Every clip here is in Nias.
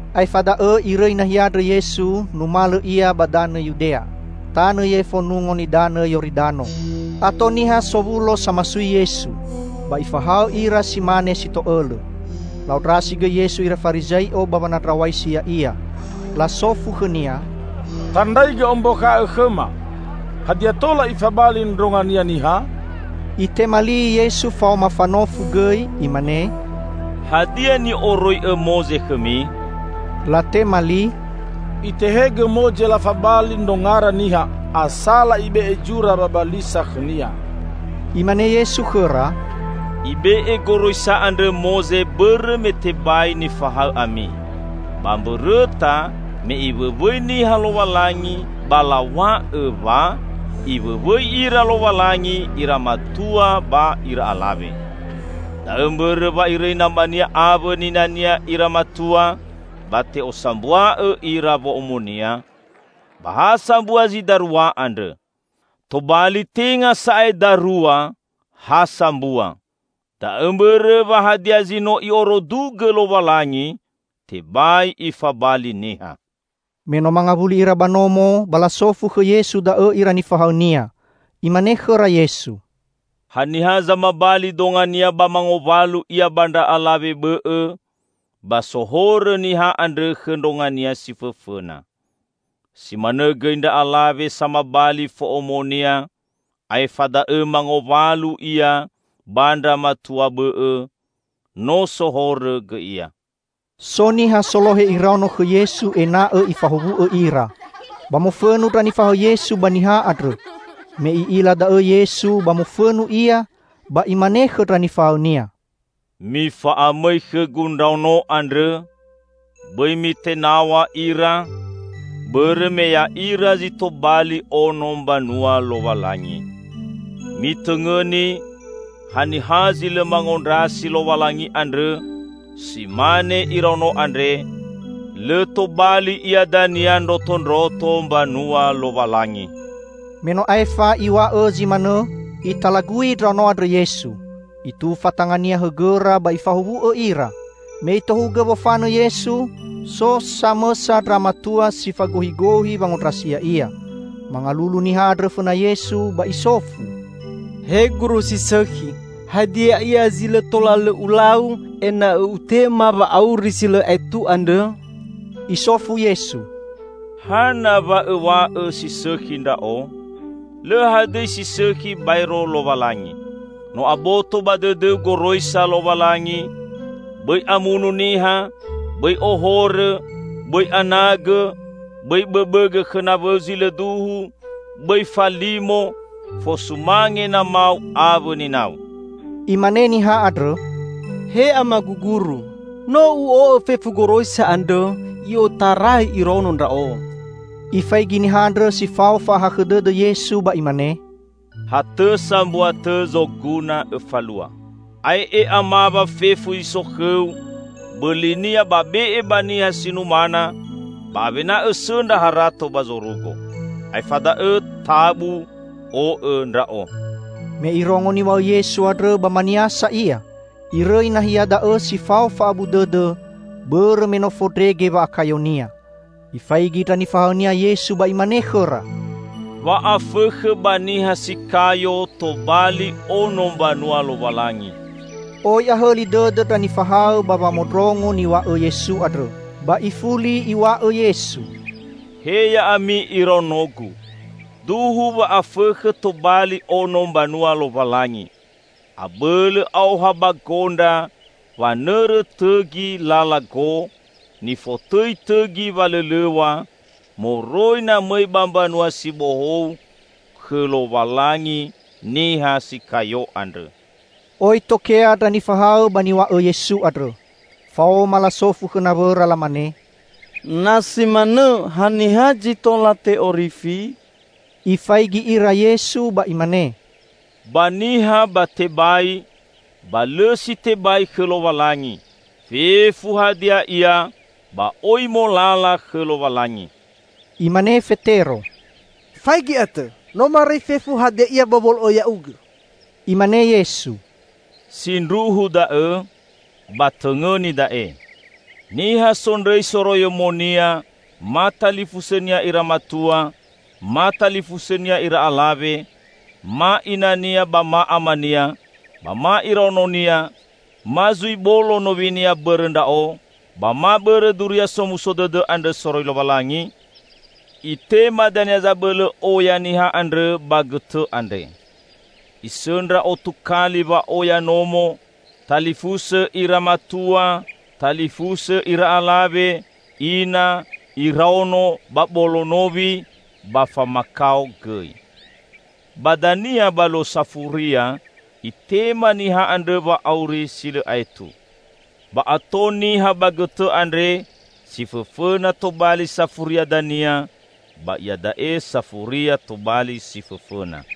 Aefa da'õ Irõi nahia andrõ Yesu, numalõ Ia ba danõ Yudea, tanõ yefo Nungo Nidanõ Yoridano. Ato niha sowulo samasui Yesu. Ba Ifahaõ ira si mane si to'õlõ. La'ondrasi gõi Yesu ira Farizai'o ba wanandraw̃aisi Ya'ia. Lasofu khõ-Nia, "Tandraigõ ombakha'õ khõma, hadia tola ifabali ndrongania niha?" Itema li Yesu faoma fanofu gõi. Imane, "Hadia ni'oroi'õ Moze khõmi?" Latema li, "Itehegõ Moze lafabali ndrongara niha asala ibe'e zura wabalisa khõnia." Imane Yesu khõra, "Ibe'e goroisa andrõ Moze bõrõ me tebai nifahaõ ami." "Ba mbõrõta, me Iwõwõi niha Lowalangi, ba law̃a'õ wa, 'Iwõwõi ira Lowalangi, ira matua ba ira alawe. Da'õ mbõrõ wa irõi namania awõ ninania ira matua ba te'osambua'õ ira wo'omonia, ba ha sambua zi darua andrõ.' Tobali tenga sa'ae darua, ha sambua. Da'õ mbõrõ, wa hadia zi no I'orudugõ Lowalangi tebai ifabali niha!" Me no mangawuli ira ba nomo ba lasofu khõ Yesu da'õ ira nifahaõ-Nia. Imane khõra Yesu, "Haniha zamabali dongania ba mangowalu ia ba ndra alawe bõ'õ, ba sohorõ niha andrõ khõ ndrongania si fõfõna. Si manõ gõi ndra alawe samabali fo'omonia aefa da'õ mangowalu ia ba ndra matua bõ'õ, no sohorõ gõi ia." So niha solohe iraono khõ Yesu ena'õ Ifahowu'õ ira. Ba mofõnu ndra nifahaõ Yesu ba niha andrõ. Me I'ila da'õ Yesu, ba mofõnu Ia, ba Imane khõ ndra nifahaõ-Nia, "Mifa'amõi khõ-Gu ndraono andrõ! Bõi mitenaw̃a ira, bõrõ me ya'ira zi tobali ono Mbanua Lowalangi. Mitõngõni! Haniha zi lõ mangondrasi Lowalangi andrõ si mane iraono andre, lõ tobali ia dania ndrotondroto mbanua Lowalangi." Me no aefa Iw̃a'õ zi manõ, Italagui ndraono andrõ Yesu, Itufa tanga-Nia hõgõra ba Ifahowu'õ ira. Me Itohugõ wofanõ Yesu, so samõsa ndra matua si fagohigohi wangondrasi Ya'ia. Mangalulu niha andrõ fõna Yesu, ba isofu, "He Guru si sõkhi, hadia ia zi lõ tola lõ ulau ena'õ utema wa'auri si lõ aetu andrõ?" Isofu Yesu, "Hana wa õw̃a'õ si sõkhi Ndra'o? Lõ hadõi si sõkhi baero Lowalangi. No aboto ba dõdõu goroisa Lowalangi, 'Bõi amunu niha; bõi ohorõ; bõi anagõ; bõi bõbõgõ khõ nawõu zi lõ duhu; bõi falimo; fosumange namau awõ ninau.'" Imane niha andrõ, "He Amagu Guru, no u'o'õ fefu goroisa andrõ i'otarai iraono ndra'o." Ifaigi niha andrõ si fao fa'ahakhõ dõdõ Yesu ba Imane, "Ha tõ sambua tõ zoguna õfalua. Ae'e, amawa fefu zi so khõu, bõlinia be'e ba niha si numana, ba awena õsõndra harato ba zorugo. Aefa da'õ tabu, o'õ Ndra'o." Me irongo niw̃a'õ Yesu andrõ ba maniasa ia, irõi nahia da'õ si fao fa'abu dõdõ bõrõ me no fondrege wa'akayonia. Ifaigi ndra nifahaõ-Nia Yesu ba Imane khõra, "Wa'afõkhõ ba niha si kayo tobali ono mbanua Lowalangi!" Oi ahõli dõdõ ndra nifahaõ ba wamondrongo niw̃a'õ Yesu andrõ. Ba ifuli Iw̃a'õ Yesu, "He Ya'ami iraono-Gu, duhu wa'afõkhõ tobali ono mbanua Lowalangi! Abõlõ aoha ba gondra wanõrõ tõgi lala gõ nifotõi tõgi walõlõw̃a moroi na mõi ba Mbanua si Bohou khõ Lowalangi niha si kayo andrõ." Oi tokea ndra nifahaõ ba niw̃a'õ Yesu andrõ. Faoma lasofu khõ nawõra, lamane "Na simanõ, haniha zi tola te'orifi?" Ifaigi ira Yesu ba Imane, "Ba niha ba tebai, ba lõ si tebai khõ Lowalangi; fefu hadia ia ba oi molala khõ Lowalangi." Imane Fetero, "Faigi atõ, no marõi fefu hadia ia ba wolo'õ Ya'ugõ." Imane Yesu, "Sindruhu da'õ, ba tõngõni da'e: niha sondrõi soroiyomonia, ma talifusõnia ira matua, ma talifusõnia ira alawe, ma inania ba ma amania, ba ma iraononia, ma zui bolo nowinia bõrõ Ndra'o, ba ma bõrõ Duria Somuso Dõdõ andrõ soroi Lowalangi, itema dania zabõlõ oya niha andrõ ba gõtõ andre. Isõndra otu kali wa'oya nomo, talifusõ ira matua, talifusõ ira alawe, ina, iraono ba bolo nowi -- ba famakao gõi. Ba dania ba luo safuria, itema niha andrõ wa'auri si lõ aetu. Ba ato niha ba gõtõ andre, si fõfõna tobali safuria dania ba iada'e safuria tobali si fõfõna."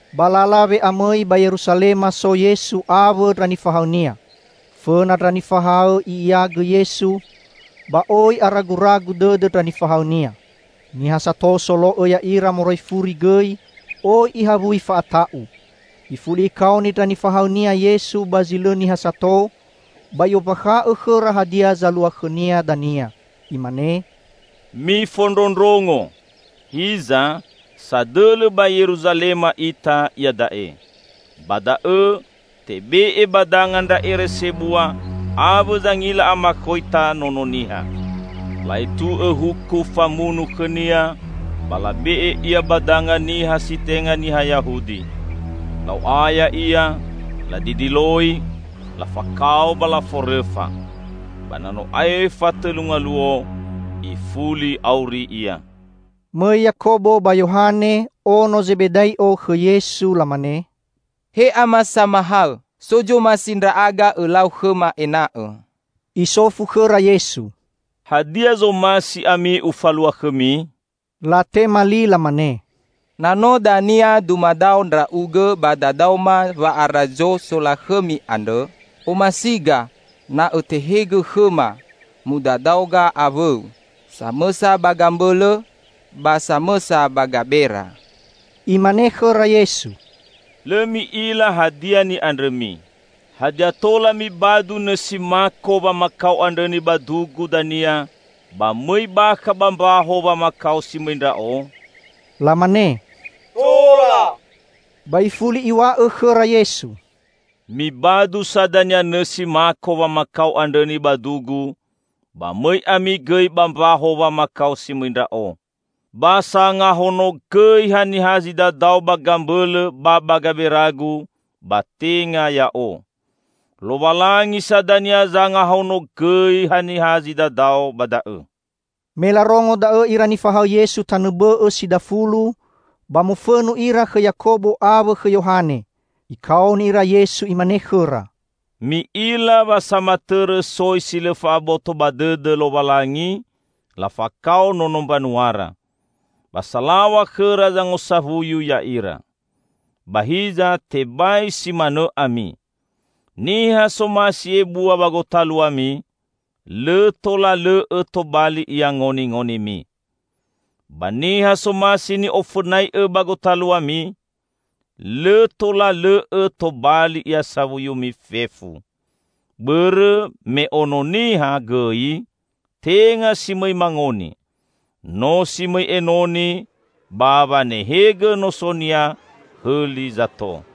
Ba lala we'amõi ba Yeruzalema so Yesu awõ ndra nifahaõ-Nia. Fõna ndra nifahaõ I'iagõ Yesu, ba oi araguragu dõdõ ndra nifahaõ-Nia. Niha sato solo'õ ya'ira moroi furi gõi oi ihawui fa'ata'u. Ifuli Ikaoni ndra nifahaõ-Nia Yesu ba zi lõ niha sato, ba I'ombakha'õ khõra hadia zalua khõ-Nia dania. Imane, "Mifondrondrongo! Hiza, sadõlõ ba Yeruzalema ita iada'e. Ba da'õ, tebe'e ba danga ndra ere sebua awõ zangila amakhoita Nono Niha. La'etu'õ huku famunu khõ-Nia, ba labe'e Ia ba danga niha si tenga niha Yahudi. La'o'aya Ia, ladidiloi, lafakao ba laforõfa. Ba na no aefa tõlu ngaluo, ifuli auri Ia." Mõi Yakobo ba Yohane, ono Zebedai'o khõ Yesu, lamane: "He Ama Samahaõ, so zomasi ndra'aga Õlau khõma ena'õ." Isofu khõra Yesu, "Hadia zomasi ami Ufalua khõmi?" Latema li lamane, "Na no dania dumadao Ndra'ugõ ba dadaoma wa'arazo solakhõmi andrõ, omasiga na Õtehegõ khõma mudadaoga awõ-U, samõsa ba gambõlõ ba samõsa ba gabera." Imane khõra Yesu, "Lõ mi'ila hadia ni'andrõmi. Hadia tola mibadu nõsi mako wamakao andrõ nibadu-Gu dania ba mõi bakha ba mbaho wamakao si mõi Ndra'o?" Lamane, "Tola". Ba ifuli Iw̃a'õ khõra Yesu, "Mibadu sa dania nõsi mako wamakao andrõ nibadu-Gu, ba mõi ami gõi ba mbaho wamakao si mõi Ndra'o. Ba sangahonogõi haniha zi dadao ba gambõlõ ba ba gabera-Gu, ba tenga Ya'o. Lowalangi sa dania zangahonogõi haniha zi dadao ba da'õ." Me larongo da'õ ira nifahaõ Yesu tanõ bõ'õ si dafulu ba mofõnu ira khõ Yakobo awõ khõ Yohane. Ikaoni ira Yesu, Imane khõra, "Mi'ila wa samatõrõ soi si lõ fa'aboto ba dõdõ Lowalangi, lafakao nono mbanuara. Ba salaw̃a khõra zangosawuyu ya'ira. Ba hiza tebai si manõ ami! Niha somasi ebua ba gotaluami, lõ tola lõ'õ tobali ia ngoningonimi. Ba niha somasi ni'ofõnai'õ ba gotaluami, lõ tola lõ'õ tobali ia sawuyumi fefu. Bõrõ me Ono Niha gõi tenga si mõi mangoni. No si mõi enoni ba wanehegõ noso-Nia hõli zato."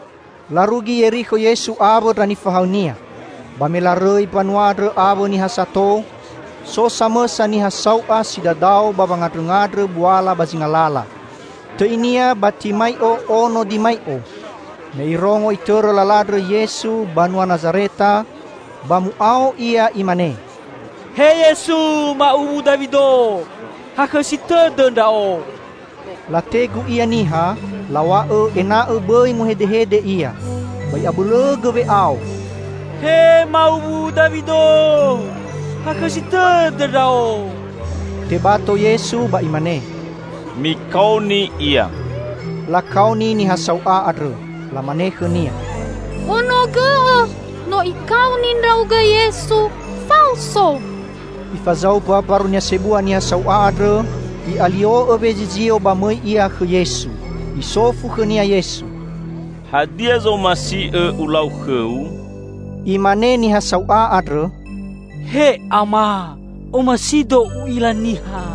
Larugi Yerikho Yesu awõ ndra nifahaõ-Nia. Ba me larõi mbanua andrõ, awõ niha sato, so samõsa niha sau'a si dadao ba wangandrõngandrõ buala ba zinga lala. Tõinia Batimai'o, ono Dimai'o. Me irongo Itõrõ lala andrõ Yesu, banua Nazareta, ba mu'ao ia imane, "He Yesu, ma'uwu Dawido! Hakhõsi tõdõ ndra'o!" Lategu ia niha, law̃a'õ ena'õ bõi muhedehede ia. Ba i'abõlõgõ we'ao, "He ma'uwu Dawido, hakhõsi tõdõ ndra'o!" Tebato Yesu ba Imane, "Mikaoni ia." Lakaoni niha sau'a andrõ. Lamane khõnia, "Honogõ'õ! No Ikaoni ndra'ugõ Yesu, faoso!" Ifazaumba mbarunia sebua niha sau'a andrõ, i'alio'õ wezizio ba mõi ia khõ Yesu. Isofu khõnia Yesu, "Hadia zomasi'õ Ulau khõu?" Imane niha sau'a andrõ, "He Ama. Omasido u'ila niha."